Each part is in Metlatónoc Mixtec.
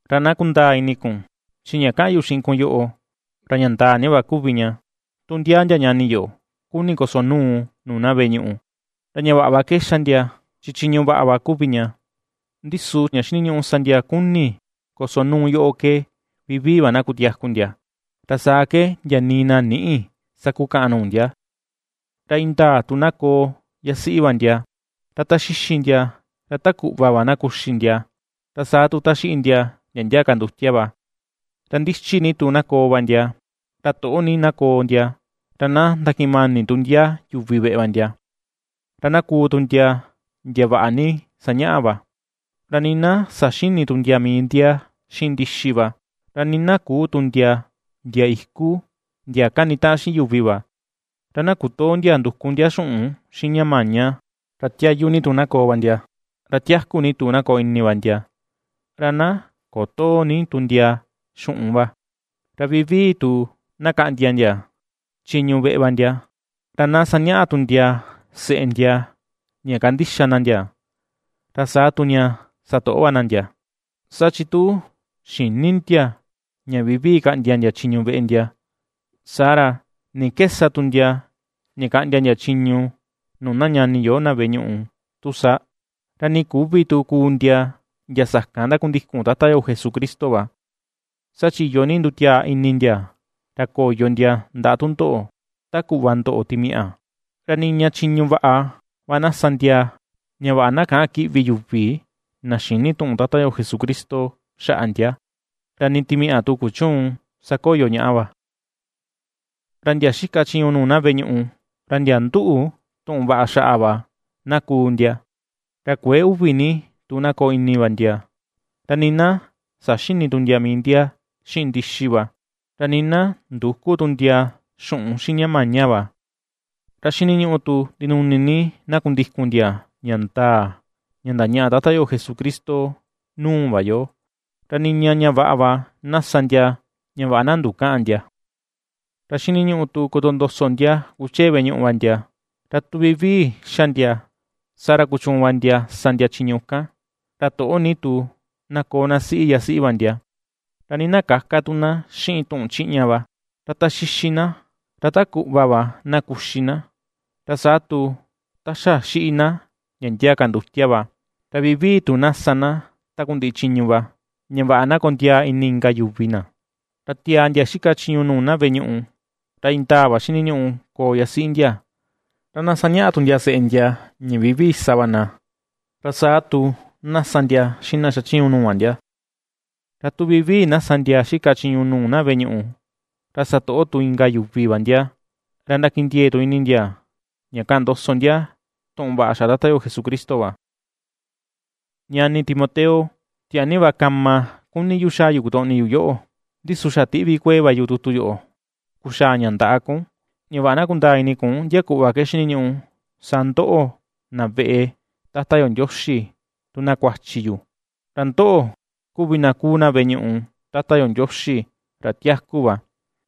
Ra na kundaa ini kun, chi ña kaꞌan yu xiꞌin kun yoꞌo, ra ña ndaa ni va kuvi ña: Tu ndia ndia ñani yo kuni kosonuu nuu na veꞌe ñuꞌu, ra ña vaꞌa va ke ^xa ndia chi chiñu vaꞌa va kuvi ña. Ndi su ña xiniñuꞌu sa ndia kuni kosonuu yoꞌo ke vivii va na kutiaku ndia, ra saa ke ndia nii na nïꞌi sakukaꞌan nuu ndia. Ra indaa tu na koo yasiꞌi va ndia, ra ta xixi ndia ra ta kuꞌva va na kuxi ndia, ra saa tu ta xiꞌi ndia, ndia ndia ka ndutia va, ra ndichi ni tu na koo va ndia, ra toꞌo ni na koo ndia, ra na ndakiꞌin mani tu ndia yuvi veꞌe va ndia, ra na kuu tu ndia ndia vaꞌa ni sañaꞌa va; ra nii na saxïni tu ndia mii ndia xiꞌin ndixi va, ra nii na küu tu ndia ndia iku ndia kanitaꞌan xiꞌin yuvi va, ra na kutöo ndia nduku ndia xuꞌun xiꞌin ña maña, ra tiayu ni tu na koo va ndia, ra tiaku ni tu na koo ini va ndia, ra na kotöo ni tu ndia xuꞌun va; ra vivii tu na kaꞌndia ndia chiñu veꞌe va ndia, ra na sañaꞌa tu ndia seꞌe ndia ña kandixa na ndia, ra saa tu ña satoꞌo va na ndia, saa chi tu xïni ndia ña vivii kaꞌndia ndia chiñu veꞌe ndia, saa ra, ¿ni ke sa tu ndia ña kaꞌndia ndia chiñu nuu na ñani yo na veꞌe ñuꞌu tu sa? Ra nii küvi tu kuu ndia ndia sakan ndakundikun Tata yo Jesucristo va, saa chi iyo ni ndutiaa ini ndia ra koyo ndia ndaꞌa tundoꞌo ta kuꞌva ndoꞌo timiaꞌa. Ra niña chiñu vaꞌa va na sa ndia ña vaꞌa na käꞌan kiꞌvi yuvi na xïni tuꞌun Tata yo Jesucristo xaꞌa ndia, ra nii timiaꞌa tu kuchüun sakoyo ñaꞌa va. Ra ndia xika chiñu nuu na veꞌe ñuꞌu, ra ndia nduꞌu tuꞌun vaꞌa xaꞌa va na kuu ndia; ra kuëe uvi ni tu na koo ini va ndia, ra nii na saxïni tu ndia mii ndia xiꞌin ndixi va, ra nii na ndüku tu ndia xuꞌun xiꞌin ña maña va. Ra xiniñuꞌu tu ndinuni ni na kundikun ndia ña ndaa ña ndañaꞌa Tata yo Jesucristo nuu va yo, ra niña ña vaꞌa va na sa ndia ña vaꞌa na ndukäꞌan ndia. Ra xiniñuꞌu tu kotondoso ndia kuchee veꞌe ñuꞌu va ndia, ra tu vivii ^xa ndia, saa ra kuchuun va ndia sa ndia chiñu kan. Ra toꞌo ni tu na koo na siꞌi yasiꞌi va ndia, ra nii na käka tu na xiꞌin tuꞌun chiꞌña va, ra ta ^xixi na ra ta kuꞌva va na kuxi na, ra saa tu ta xa xiꞌi na ndia ndia ka ndutia va, ra vivii tu na sa na takundiꞌi chiñu va, ña vaꞌa na ^kondiaa ini inka yuvi na. Ra tiaa ndia xika chiñu nuu na veꞌe ñuꞌu, ra indaa va xiniñuꞌu koo yasiꞌi ndia, ra na sañaꞌa ndia seꞌe ndia, ña vivii na sa va na, ra saa tu na sa tu ndia xiꞌin na xachiñu nuu va ndia. Ra tu vivii na sa ndia xika chiñu nuu na veꞌe ñuꞌu, ra satoꞌo tu inka yuvi va ndia, ra ndakindiee tu ini ndia ña kaꞌan ndoso ndia tuꞌun vaꞌa xaꞌa Tata yo Jesucristo va. Ñani Timoteo, tiaa ni va kama kuni yu xaa yu kotoꞌni yu yoꞌo; ndi su xa tiꞌvi kuee va yu tutu yoꞌo kuxaa ña ndaꞌa kun, ña vaꞌa na kundaa ini kun ndia kuꞌva ke xiniñuꞌu sa ndoꞌo na veꞌe Tata yo Ndioxi tu na kuachi yu. Ra ndoꞌo kuvi na kuu na veꞌe ñuꞌu Tata yo Ndioxi ra tiaku va,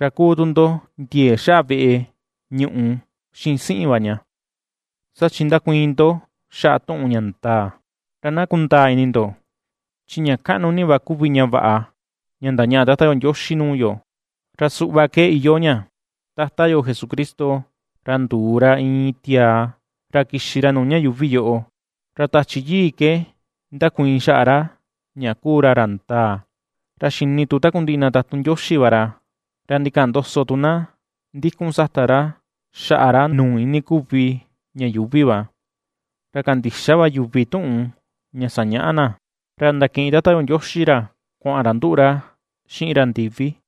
ra ^kuu tu ndo ndiee xaꞌa veꞌe ñuꞌu xiꞌin siꞌin va ña, saa chi ndakuiin ndo xaꞌa tuꞌun ña ndaa. Ra na kundaa ini ndo, chi ña kaꞌnu ni va kuvi ña vaꞌa ña ndañaꞌa Tata yo Ndioxi nuu yo, ra suꞌva ke iyoo ña: Tata yo Jesucristo, ra nduu ra iin tiaa ra kixi ra nuu ña yuuvi yoꞌo; Ra Tachi Yii ke ndakuiin xaꞌa ra ña ^kuu ra ra ndaa, ra xini tu takundiꞌi na tatun Ndioxi va ra. Ra ndikaꞌan ndoso tu na ndikun sata ra xaꞌa ra nuu ini kuvi ña yuuvi va, ra kandixa va yuvi tuꞌun ña sañaꞌa na, ra ndakiꞌin Tata yo Ndioxi ra kuaꞌan ra nduꞌu ra xiꞌin ra ndivi.